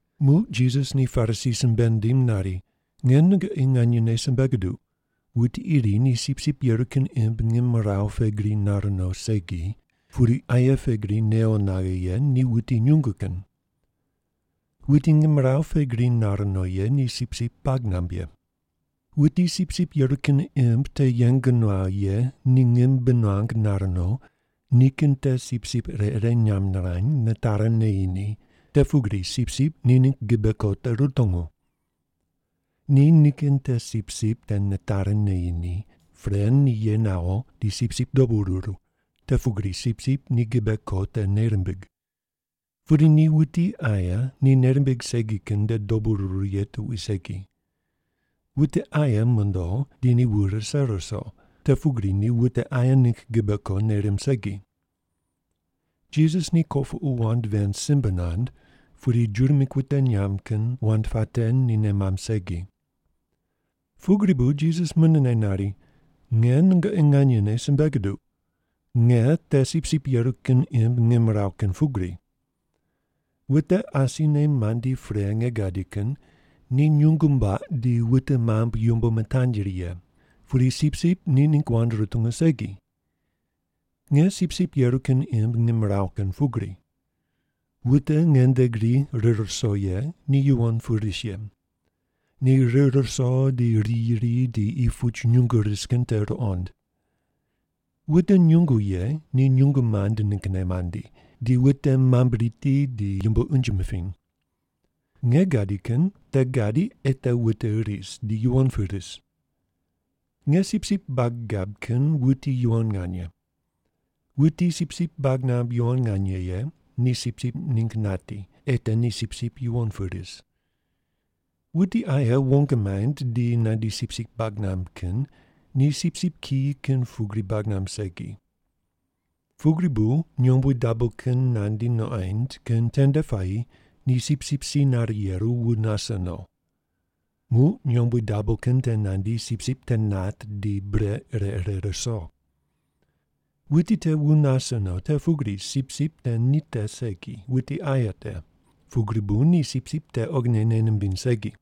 Muq Jisas ni Parisi simbe nindim nari, “Nge nungoqi nganyene simbe guduq, wuti iri ni sipsip yeru kin imb ngimrawu pe gri nar no segi, pudi aye pe gri newo naghe ye ni wuti nyungu kin. Wuti ngimrawu pe gri nar no ye ni sipsip bag namb ye. Wuti sipsip yeru kin imb te yeng nuaw ye ni ngim bi nuang nar no, nikin te sipsip ire ire nyamb nirany, nitari neyi ni, te pugri sipsip ni ningg gibe ko te rutungu. Ni nikin te sipsip te nitari neyi ni, pre ni ye nawo, di sipsip dobu ruru, te pugri sipsip ni gibe ko te nei rimbig. Pudi ni wuti aye ni nei rimbig segi kin nde dobu ruru ye tuqui segi. Wute aye mondo di ni wu rise ruso, te pugri ni wute aye ningg gibe ko nei rimb segi.” Jisas ni kopuqu wand ven simbe nand, pudi Juda mingg wute nyamb kin wand puate ni nei mamb segi. Pugri bu Jisas munene nari, “Nge nungoqi nganyene simbe guduq, nge te sipsip yeru kin imb ngimrawu kin pugri. Wute asine mandi pre nge gadi kin ni nyungu mbuaq di wute mambui yumbo mitanyri ye, pudi sipsip ni ningg wand rutungu segi. Nge sipsip yeru kin imb ngimrawu kin pugri. Wute nge nde gri rir ruso ye ni yuwon pu ris ye. Ni rir ruso di riyi ri di qi puch nyungo ris kin te ruqond. Wute nyungu ye ni nyungu mand ninggne mandi, di wute mamb riti di yumbo unje mipiny. Nge gadi kin te gadi ei te wute ris, di yuwon pu ris. “Nge sipsip bag gab kin wuti yuwon nganye. Wuti sipsip bag namb yuwon nganye ye ni sipsip ningg nati, ei te ni sipsip yuwon pu ris. Wuti aye wong maind di nandi sipsip bag namb kin ni sipsip kiyi kin pugri bag namb segi. Pugri bu nyombui dabo kin nandi nuqoind kin tende puayi ni sipsip si nare yeru wu nase no. Muq nyombui dabo kin te nandi sipsip te nat di bure ire ire ruso. Wuti te wu nase no, te pugri sipsip te ni te segi wuti aye te, pugri bu ni sipsip te oghine nei nimbiny segi.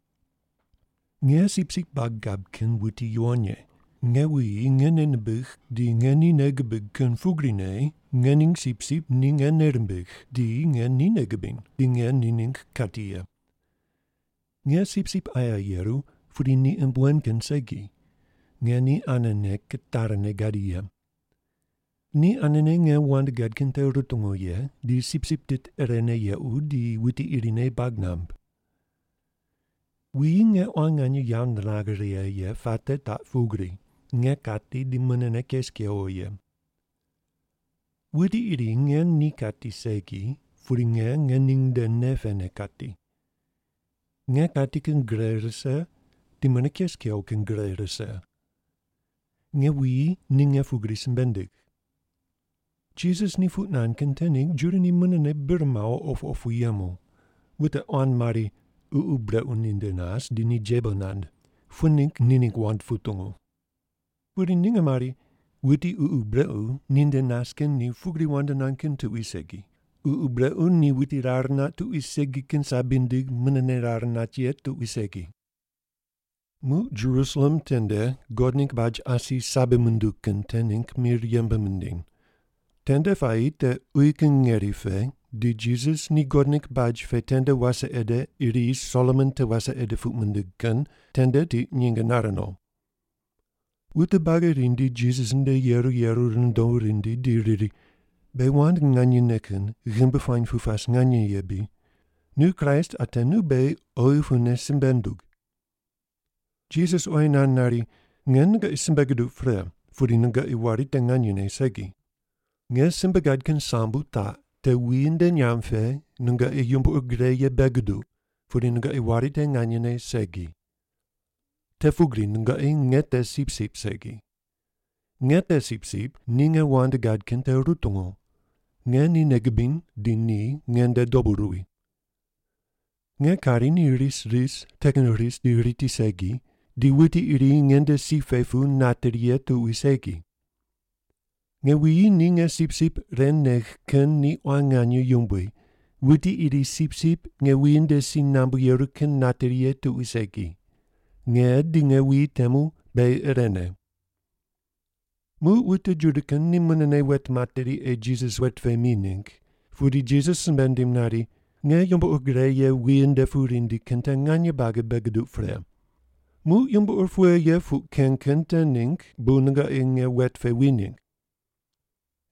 “Nge sipsip bag gab kin wuti yuwon ye. Nge wuyi nge nei nimbigh di nge ni nei gibig kin pugrine nge ning sipsip ni nge nei rimbigh, di nge ni nei gibiny, di nge ni ningg kati ye. Nge sipsip aye yeru, pudi ni imb wen kin segi. Nge ni anene kitari ne gadi ye. Ni anene nge wand gad kin te rutungu ye, di sipsip tit irene yequ di wuti irine bag namb. Wuyi nge quan nganye yawo niragh righe ye puate taq pugri, nge kati di munene kes kewo ye. Wuti iri nge ni kati segi, pudi nge ngening nde nei pene kati. Nge kati kin gre rise, di mune kes kewo kin gre rise. Nge wuyi ni nge pugri simbe nindigh.” Jisas ni puq nand kin te ningg Juda ni munene bir mawo opu opu yemu. Wute quan mari, “Ququ brequ ninde nas, di ni jebo nand. Pughe ningg ni ningg wand putungu?” Pudi ninge mari, “Wuti ququ brequ ninde nas kin ni pugri wand nand kin tuqui segi. Ququ brequ ni wuti rar nat tuqui segi kin sabi nindig munene rar nat ye tuqui segi.” Muq Jerusalem tende God ningg baj asi sabi munduw kin te ningg mir yembe mindiny. Tende puayi te uyi kin ngeri pe, di Jisas ni God ningg baj pe tende wase ede iri Solomon te wase ede puq mindig kin tende tiq nyinge nare no. Wute buagi rindi Jisas nde yeru yeru rundo rindi di riri, “Beghi wand nganyene kin ghimbi puany pu pas nganye ye bri? Nu Kraist ate nu beghi oghi pune simbe ndug.” Jisas oyi nand nari, “Nge nungoqi simbe guduq pre, pudi nungoqi wari te nganyene segi. Nge simbe gad kin sambu taq te wuyi nde nyamb pe nungoqi yumbo ur gre ye bei guduq, pudi nungoqi wari te nganyene segi. Te pugri nungoqi nge te sipsip segi. Nge te sipsip ni nge wand gad kin te rutungu. Nge ni nei gibiny, di ni nge nde dobu ruwi. Nge kari ni ris ris te kin ris di riti segi, di wuti iri nge nde si pe pu nateri ye tuqui segi. Nge wuyi ni nge sipsip ren negh kin ni quan nganye yumbui, wuti iri sipsip nge wuyi nde si nambu yeru kin nateri ye tuqui segi. Nge di nge wuyi temu beghi irene.” Muq wute Juda kin ni munene wet materi ei Jisas wet pe mi ningg, pudi Jisas simbe nindim nari, “Nge yumbo ur gre ye wuyi nde pu rindi kin te nganye buagi bei guduq pre. Muq yumbo ur pughe ye puq ken kin te ningg bu nungoqi nge wet pe wi ningg?”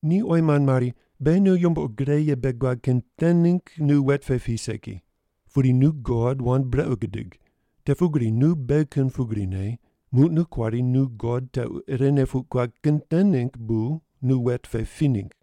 Ni oyi mand mari, “Beghi nu yumbo ur gre ye bei guad kin te ningg nu wet pe pi segi. Pudi nu God wand brequ gudig, te pugri nu beghi kin pugrine, muq nu kuari nu God tequ irene puq guad kin te ningg bu nu wet pe pi ningg.”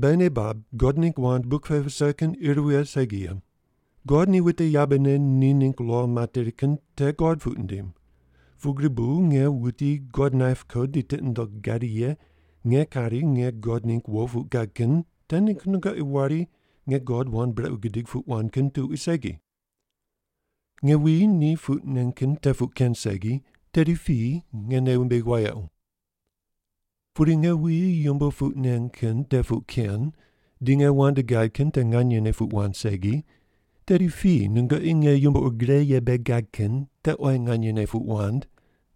Beghi nei bab God ningg wand buk pe vise kin ir vighe segi ye. God ni wute yabene ni ningg lo materi kin te god puq nindim, pugri bu nge wuti God naip ko di tiqi nundogh gadi ye nge kari nge God ningg wo puq gad kin te ningg nungoqi wari nge God wand brequ gidig puq wand kin tuqui segi. Nge wuyi ni puq nen kin te puq ken segi, tedi piyi nge nei wumbigh wayequ. Pudi nge wuyi yumbo puq nen kin te puq ken di nge wand gad kin te nganyene puq wand segi, tedi piyi nungoqi nge yumbo ur gre ye bei gad kin te oyi nganyene puq wand,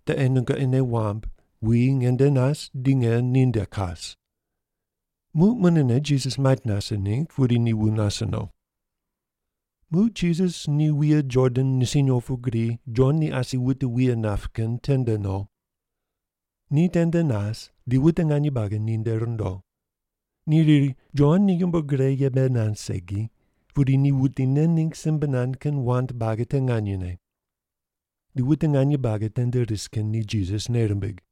te ei nungoqi nei wamb wuyi nge nde nas di nge ninde kas.” Muq munene Jisas mait nase ningg, pudi ni wu nase no. Muq Jisas ni wuye Jordan nisiny opu gri Jon ni asi wute wuye nap kin tende no. Ni tende nas, di wute nganye buagi ninde rundo. Ni riri, “Jon ni yumbo ur gre ye bei nand segi, pudi ni wuti nen ningg simbe nand kin wand buagi te nganyene.” Di wute nganye buagi tende ris kin ni Jisas nei rimbig.